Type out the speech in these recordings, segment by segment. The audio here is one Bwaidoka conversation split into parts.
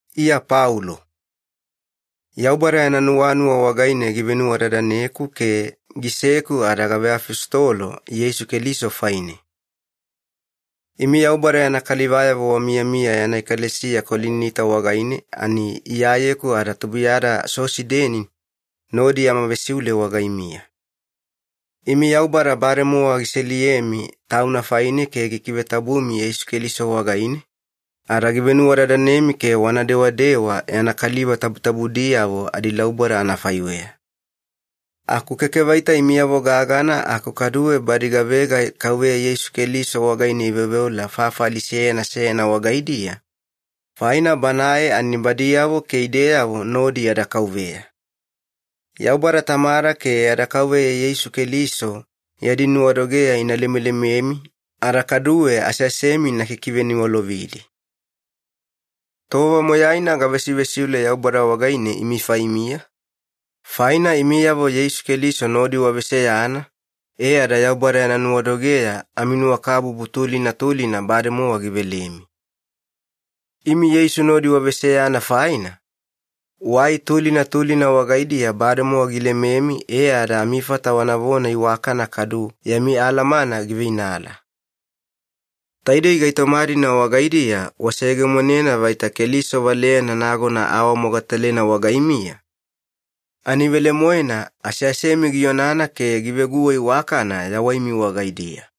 Iya Paulo. Yaubada yana nuwanuwa wagaine givenuwadadaneku ke giseku ada gaveafositolo Yeisu Keliso faine. Imi Yaubada yana kalivayavo wamiyamiya yana ekalesiya Kolinita wagaine, ani Iyayeku ada tubuiyada Sosideni nodi yama vesiule wagaimiya. Imi Yaubada bademowa giseliyemi Tauna faine ke gikivetabumi Yeisu Keliso wagaine, ada givenuwadadanemi ke wana dewadewa yana kaliva tabutabudiyavo adilauboda anafaiweya. Aku keke vaita imiyavo gagana, aku kaduwe badi gavega Kauveya Yeisu Keliso wagaine iveoveola fafali seyana seyana wagaidiya, faina Banae ani badiyavo ke ideyavo nodi yada Kauveya. Yaubada Tamada ke yada Kauveya Yeisu Keliso yadi nuwadogeya ina lemelememi ada kaduwe aseasemi ina kikiveniwalovidi. Tova moyaina gavesivesiule Yaubada wagaine imi faimiya, faina imiyavo Yeisu Keliso nodi waveseyana e ada Yaubada yana nuwadogeya aminuwakabubu tulina tulina bademowa givelemi. Imi Yeisu nodi waveseyana faina, wai tulina tulina wagaidiya bademowa gilememi e ada amifata wanavona iwakana kadu yami alamana giveinala. Taidei gaitoma-dina wagaidiya waseyegemonena vaita Keliso valeyana nagona aawamogatalena wagaimiya, ani velemoena aseasemi gionana ke giveguwa iwakana yawaimi wagaidiya.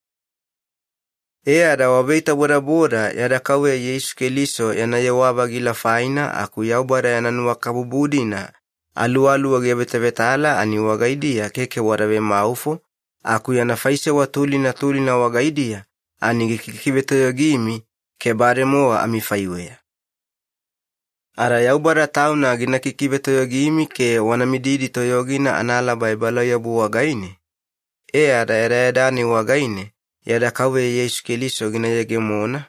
E ada waveitabodaboda yada Kauveya Yeisu Keliso yana yewa-vagila faina, aku Yaubada yana nuwakabubu-dina Aluwaluwa giavetavetala ani wagaidiya keke wada vemaufo, aku yana faisewa tulina tulina wagaidiya ani gikikivetoyogimi ke bademowa amifaiweya. Ada Yaubada Tauna gina kikivetoyogimi ke wana mididi toyogina analaba ebalauyabu wagaine, e ada yadayada-nai wagaine yada Kauveya Yeisu Keliso gina yegemona,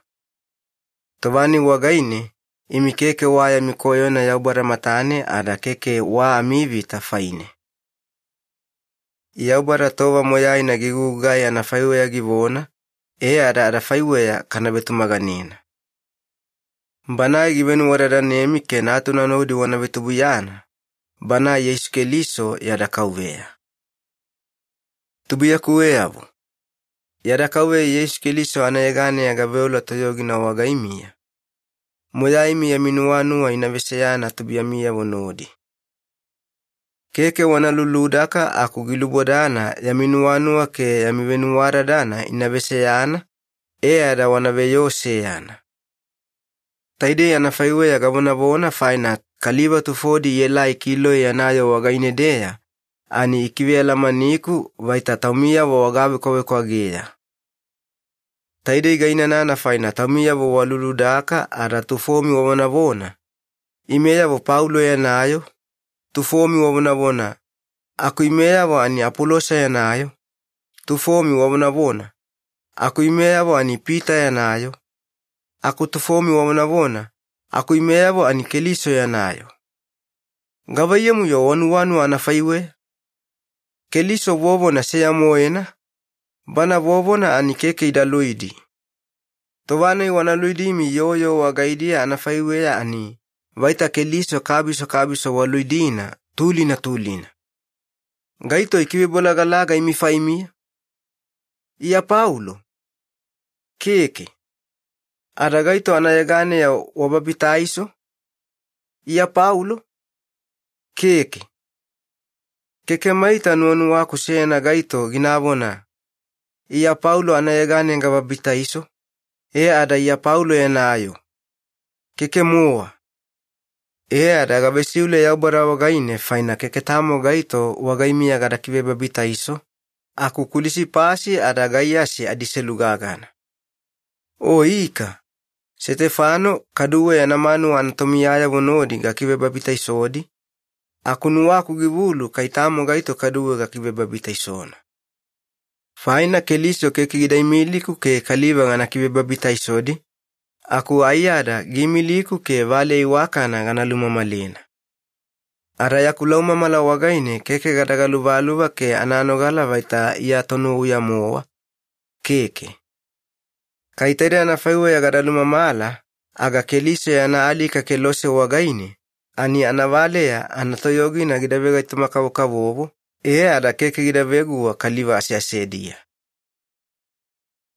tova-nai wagaine imi keke wa yami koyona Yaubada matane ada keke wa amivita faine. Yaubada tova moyaina gigugugai anafaiweya givona, e ada adafaiweya kana vetumaganena. Banae givenuwadadanemi ke Natuna nodi wana vetubuiyana, Banae Yeisu Keliso yada Kauveya. Tubuiyakuweyavo, yada Kauveya Yeisu Keliso anayeganeya gaveola toyogina wagaimiya, moyaimi yami nuwanuwa ina veseyana tubuiyamiyavo nodi. Keke wana luludaka, aku gilubodana yami nuwanuwa ke yami venuwadadana ina veseyana, e ada wana veyoo seyana. Taidei anafaiweya gavonavona, faina kaliva tufodi ielai Kiloe yana yoo wagaine-deya, ani ikivealamaniku vaita taumiyavo wagavekwavekwageya. Taidei gainanana faina taumiyavo waluludaka, ada tufomi wavonavona, “Imeyavo Paulo yana yoo,” tufomi wavonavona, “Aku imeyavo ani Apolosa yana yoo,” tufomi wavonavona, “Aku imeyavo ani Pita yana yoo,” aku tufomi wavonavona, “Aku imeyavo ani Keliso yana yoo.” Gavaiyamu-yo wanuwanuwa anafaiweya? Keliso vovona seya-moena, Bana vovona ani keke ida luidi. Tova-nai wana luidimi yoo yoo wagaidiya anafaiweya, ani vaita Keliso kabiso kabiso waluidina tulina tulina. Gaito ikivebolagalaga imi faimiya? Iya Paulo? Keke! Ada gaito anayeganeya wababitaiso? Iya Paulo? Keke! Keke maita nuwanuwaku seyana gaito ginavona, “Iya Paulo anayeganeya gababitaiso, e ada Iya Paulo yana yoo.” Keke-mowa. E ada gavesiule Yaubada wagaine, faina keke tamo gaito wagaimiya gada kivebabitaiso, aku Kulisipasi ada Gaiyasi adiselu gagana. O ika, Setefano kaduwe yana manuwa anatomiyayavo nodi gakivebabitaisodi, aku nuwaku givulu kai tamo gaito kaduwe gakivebabitaisona. Faina Keliso keke gida imiliku ke kaliva gana kivebabitaisodi, aku aiyada giimiliku ke valeya iwakana gana lumamalena. Ada yaku laumamala wagaine, keke gada galuvaluva ke ananogala vaita Iya tonuwauya-mowa, keke. Kai taide anafaiweya gada lumamala aga Keliso yana alika kelose wagaine, ani anavaleya anatoyogina gida vegaitoma-kavokavovo e ada keke gida veguwa kaliva aseasediya.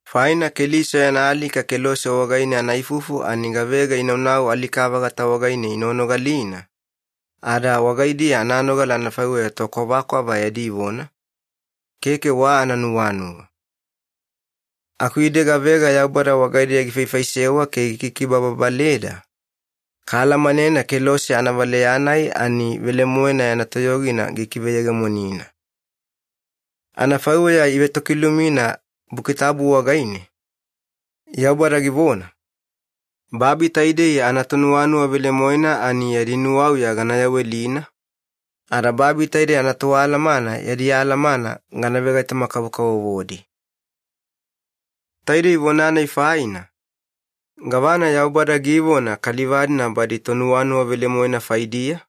Faina Keliso yana alika kelose wagaine anaifufu, ani gavega inaunau alika-vagata wagaine inoganogalina, ada wagaidiya ananogala anafaiweya tokwavakwava yadi vona, keke wa ananuwanuwa. Aku ide gavega Yaubada wagaideya gifaifaisewa ke gikikibababaleda, kaalamanena kelose anavaleya-nai ani velemoena yana toyogina gikiveyegemonina. Anafaiweya ivetokilumina Buki Tabu wagaine, Yaubada givona, “Babi taidei anatonuwanuwa velemoena ani yadi nuwauya gana yawelina, ada babi taidei anatoalamana yadi alamana gana vegaitoma-kavokavovodi.” Taidei vona-nai faina, gavana Yaubada givona kaliva-dina badi tonuwanuwa velemoena faidiya?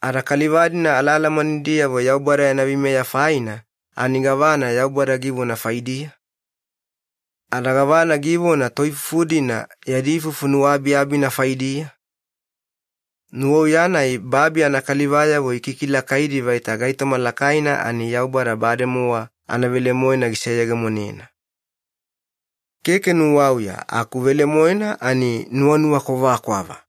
Ada kaliva-dina alaalamanidiyavo Yaubada yana veimeya faina, ani gavana Yaubada givona faidiya? Ada gavana givona toifufu-dina yadi ifufu nuwaabiabina faidiya? Nuwauya-nai babi anakalivayavo ikikilakaidi vaita gaitoma lakaina, ani Yaubada bademowa anavelemoena giseyegemonena. Keke nuwauya, aku velemoena ani nuwanuwa kwavakwava.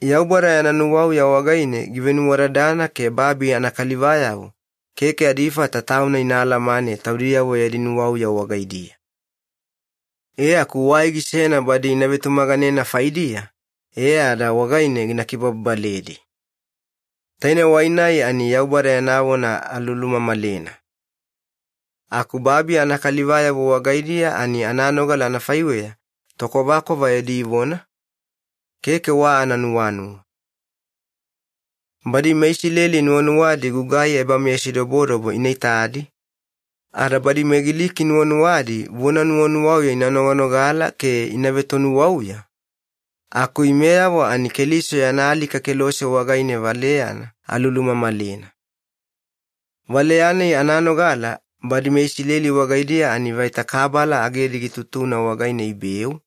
Yaubada yana nuwauya wagaine givenuwadadana ke babi anakalivayavo keke adifata Tauna ina alamane taudiyavo yadi nuwauya wagaidiya. E aku wai gisena badi ina vetumaganena faidiya e ada wagaine gina kibababaledi. Taine wai-nai ani Yaubada yana vona alulumamalena. Aku babi anakalivayavo wagaidiya, ani ananogala anafaiweya tokwavakwava yadi vona keke wa ananuwanuwa. Badi meIsileli nuwanuwadi gugai ebameyasidobodobo ina itadi, ada badi meGiliki nuwanuwadi vona nuwanuwauya ina noganogala ke ina vetonuwauya, aku imeyavo ani Keliso yana alika kelose wagaine valeyana alulumamalena. Valeya-nai ananogala badi meIsileli wagaidiya, ani vaita kabala agedi gitutuna wagaine ibeu,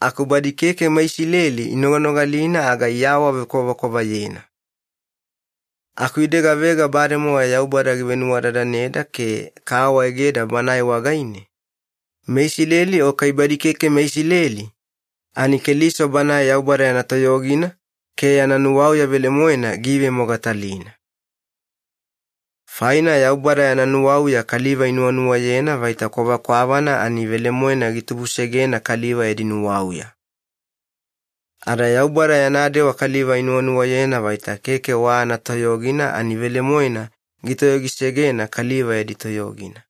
aku badi keke meIsileli inoganogalina aga iawavekwavakwavayena. Aku ide gavega bademowa Yaubada givenuwadadaneda ke kaawaegeda Banae wagaine, meIsileli o kai badi keke meIsileli, ani Keliso Banae Yaubada yana toyogina ke yana nuwauya velemoena giivemogatalina. Faina Yaubada yana nuwauya kaliva inuwanuwayena vaita kwavakwavana, ani velemoena gitubusegena kaliva yadi nuwauya. Ada Yaubada yana dewa kaliva inuwanuwayena vaita keke wa anatoyogina, ani velemoena gitoyogisegena kaliva yadi toyogina.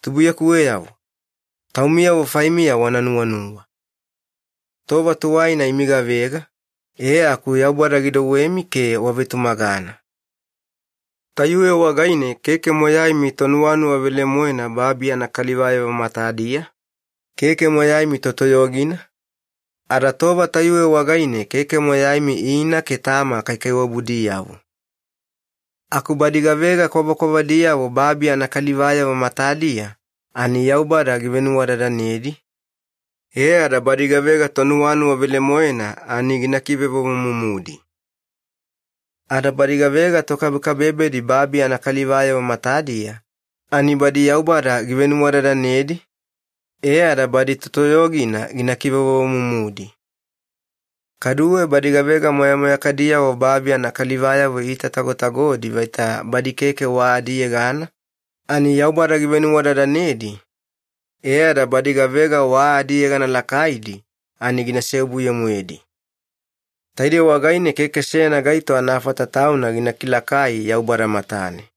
Tubuiyakuweyavo, taumiyavo faimiya wana nuwanuwa. Tova tuwaina imi gavega, e aku Yaubada gidouwemi ke wavetumagana. Tayuwe wagaine keke moyaimi tonuwanuwa velemoena babi anakalivayavo matadiya, keke moyaimi totoyogina, ada tova tayuwe wagaine keke moyaimi ina ke tama kaikaiwabudiyavo. Aku badi gavega kwavakwavadiyavo babi anakalivayavo matadiya ani Yaubada givenuwadadanedi, e ada badi gavega tonuwanuwa velemoena ani gina kivevovomumudi. Ada badi gavega tokabekabebedi babi anakalivayavo matadiya, ani badi Yaubada givenuwadadanedi e ada badi totoyogina gina kivevovomumudi. Kaduwe badi gavega moyamoyakadiyavo babi anakalivayavo iitatagotagodi vaita badi keke wa adiyegana, ani Yaubada givenuwadadanedi e ada badi gavega wa adiyegana lakaidi ani gina seobuye-moedi. Taidei wagaine keke seyana gaito anafata tauna gina kilakai Yaubada matane.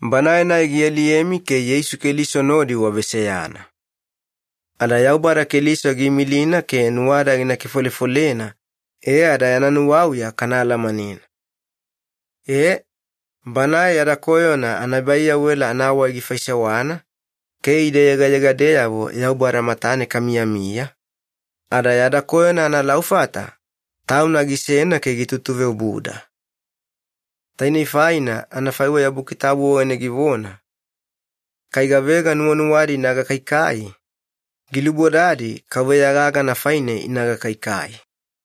Banae-nai gialiyemi ke Yeisu Keliso nodi waveseyana. Ada Yaubada Keliso giimilina ke nuwada gina kifolefolena e ada yana nuwauya kana alamanena. E, Banae yada koyona anaebaiyawela anawai gifaisewana ke ide yegayegadeyavo Yaubada matane kamiyamiya, ada yada koyona analaufata Tauna gisena ke gitutuveobuda. Tainei faina anafaiweya Buki Tabu wagaine givona, “Kai gavega nuwanuwadi ina gakaikai, gilubodadi KAUVEYA gagana faine ina gakaikai.”